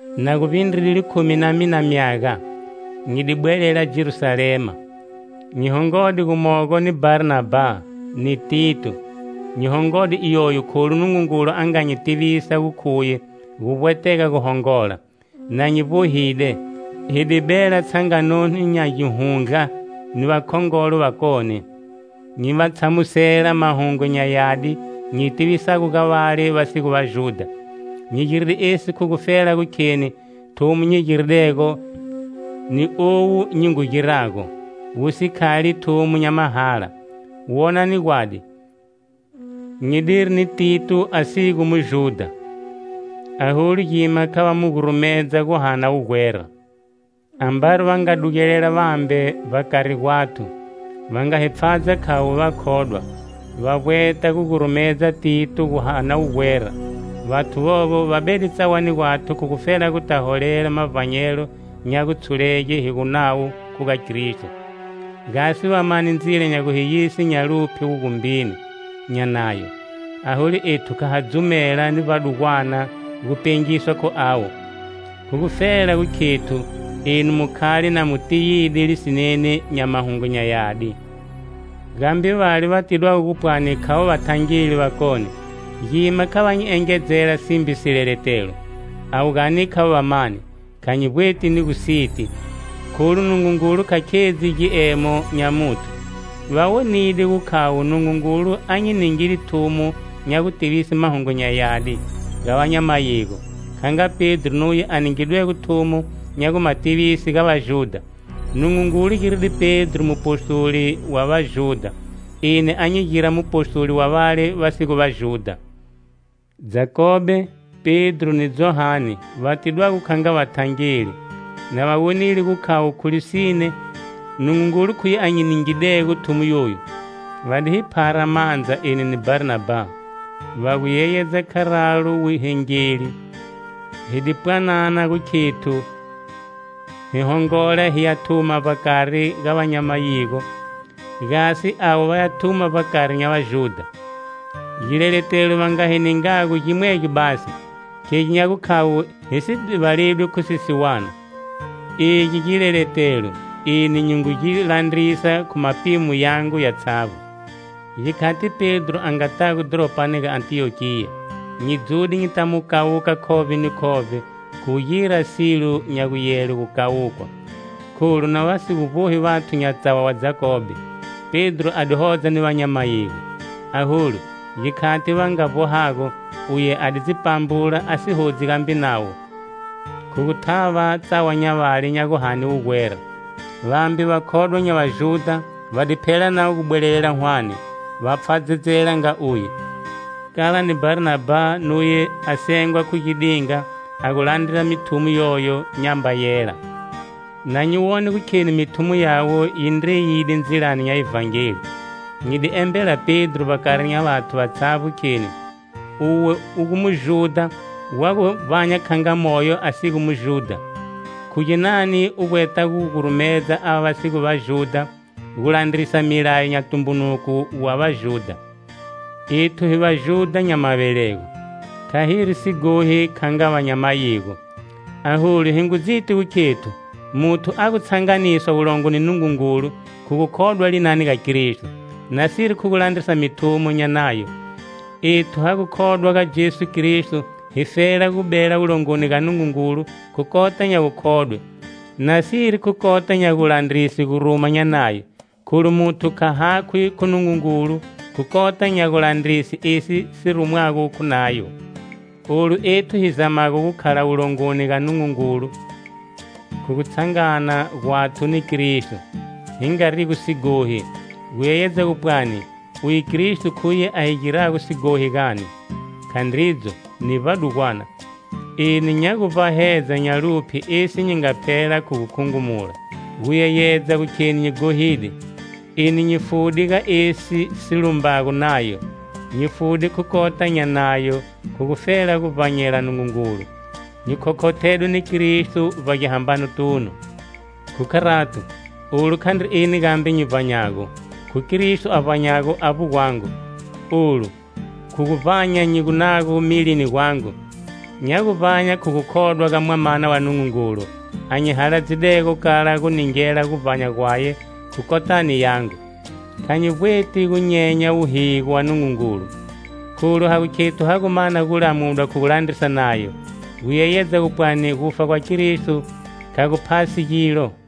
Na gu vbindride likhumi na mina myaga, nyi di bwelela Jerusalema. Nyi hongode gumogo ni Bharnabha ni Tito. Nyi hongode iyoyo kholu Nungungulu a nga nyi tivisa gu khuye gu vbwetega gu hongola. Na nyi vbohide, hi di bela tshangano nya gihundla ni vakhongolo vakone, nyi va tshamusela Mahungu nya Yadi nyi tivisago ga vale va si gu Vajudha. Nyi giride esi khu gufela gu kheni thumo nyi giridego ni owu nyi ngu girago, wu si khali thumo nya mahala. Wonani gwadi: nyi diri ni Tito a si gu Vajudha, aholu gima kha va mu gurumedza guhana wugwera. Ambari va nga dugelela vambe vbakari gwathu, va nga hi pfhadza khavo vakhodwa, va vbweta gu gurumedza Tito guhana wugwera; vathu vovo va bede tsawani gwathu khu gufela guta holelela mavbanyelo nya gutshulege hi gu nawo khu ga Kristo, gasi va mane ndzila nya gu hi yise nya luphye wugumbini nya Nayo. Aholu ethu kha ha dzumela ni vbadugwana gupengiswa khu avo, khu gufela gu khethu enu mu khale na mu tiyide lisineni nya Mahungu nya Yadi. Gambe vale va tidwago gu pwani khavo vathangeli vakone, gima kha va nyi engedzela simbe sileletelo. (Avo gani khavo vamani, kha nyi vbweti ni gu siti, kholu Nungungulu kha khedzi giemo nya muthu). Va wonide gu khavo Nungungulu a nyi ningide thumo nya gutivise Mahungu nya Yadi ga va nya mayigo, kha nga Pedro nuye a ningidwego thumo nya gu ma tivise ga Vajudha. Nungungulu giride Pedro mupostoli wa Vajudha, eni a nyi gira mupostoli wa vale va si gu Vajudha. Jakobe, Pedro ni Johane va tidwago kha nga vathangeli, na va wonile gu khavo khu lisine, Nungungulu khuye a nyi ningidego thumo yoyu; va di hi phara mandza eni ni Bharnabha, va gu yeyedza kharalo wuhengeli. Hi di pwanana gu khethu hi hongola hiya thuma vbakari ga va nya mayigo gasi avo vaya thuma vbakari nya Vajudha. Gileletelo va nga hi ningago gimwegyo basi: Khegi nya gukhavo hi si divaledwi khu sisiwana. Egi gileletelo eni nyi ngu gi landrisa khu mapimo yangu yatshavbo. Gikhati Pedro a ngatago dhoropani ga Antiyokiya, nyi dzude nyita mu kawuka khovbe ni khovbe khu gu gira silo nya guyele gu kawukwa. Kholu na va si gu vbohi vathu nya tsawa wa Jakobe, Pedro a di hodza ni va nya mayigo. Aholu, gikhati va nga vbohago, uye a di dzi pambula a si hodzi gambe navo, khu gu thava tsawa nya vale nya guhane wugwera. Vambe vakhodwa nya Vajudha va di phela navo gu bwelelela hwane, va pfhadzedzela nga uye, kala ni Bharnabha nuye a sengwa khu gidinga a gu landra mithumo yoyo nyamba yela. Na nyi wone gu kheni mithumo yawe yi ndreyide ndzilani nya Ivhangeli, nyi di embela Pedro vbakari nya vathu vatshavbo kheni: "Uwe u gu Mujudha wa gu vbanya kha nga moyo a si gu Mujudha. Khu ginani u vbweta gu gurumedza ava va si gu Vajudha gu landrisa milayo nya tumbunuko wa Vajudha?" Ethu hi Vajudha nya mavelego, kha hiri sighohi kha nga va nya mayigo. Aholu hi ngu dziti gu khethu muthu a gu tshanganiswa wulongo ni Nungungulu khu gukhodwa linani ga Kristo, nasiri khu gu landrisa mithumo nya Nayo. Ethu ha gu khodwa ga Jesu Kristo hifela gu bela wulongoni ga Nungungulu khu kota nya gukhodwe nasiri khu kota nya gulandrise guruma nya Nayo. Kholu muthu kha hakhwi khu Nungungulu khu kota nya gulandrise esi si rumwago khu Nayo. Olu ethu hi zamago gu khala wulongoni ga Nungungulu khu gutshangana gwathu ni Kristo, hi ngarigo sighohi, gu yeyedza gu pwani Uye Kristo khuye a hi girago sighohi gani? Khandridzo, ni vbadugwana. Eni nya gu vbahedza nya luphye esi nyi nga phela khu gu khungumula, gu yeyedza gu kheni nyi ghohide. Eni nyi fude ga esi si lumbago Nayo. Nyi fude khu kota nya Nayo khu gufela gu vbanyela Nungungulu. Nyi khokhothedwe ni Kristo vbagihambanotunu. Khu kharato, olu khandri eni gambe nyi vbanyago, khu Kristo a vbanyago avbo gwangu. Olu, khu guvbanya nyi gu nago milini gwagu, nya gu vbanya khu gukhodwa ga Mwamana wa Nungungulu a nyi haladzidego kala gu ningela guvbanya gwaye khu kotani yangu. Kha nyi vbweti gunyenya wuhigo wa Nungungulu. Kholu ha gu khethu ha gu mana gulamudwa khu gu landrisa Nayo, gu yeyedza gu pwani gufa gwa Kristo kha gu phasi gilo.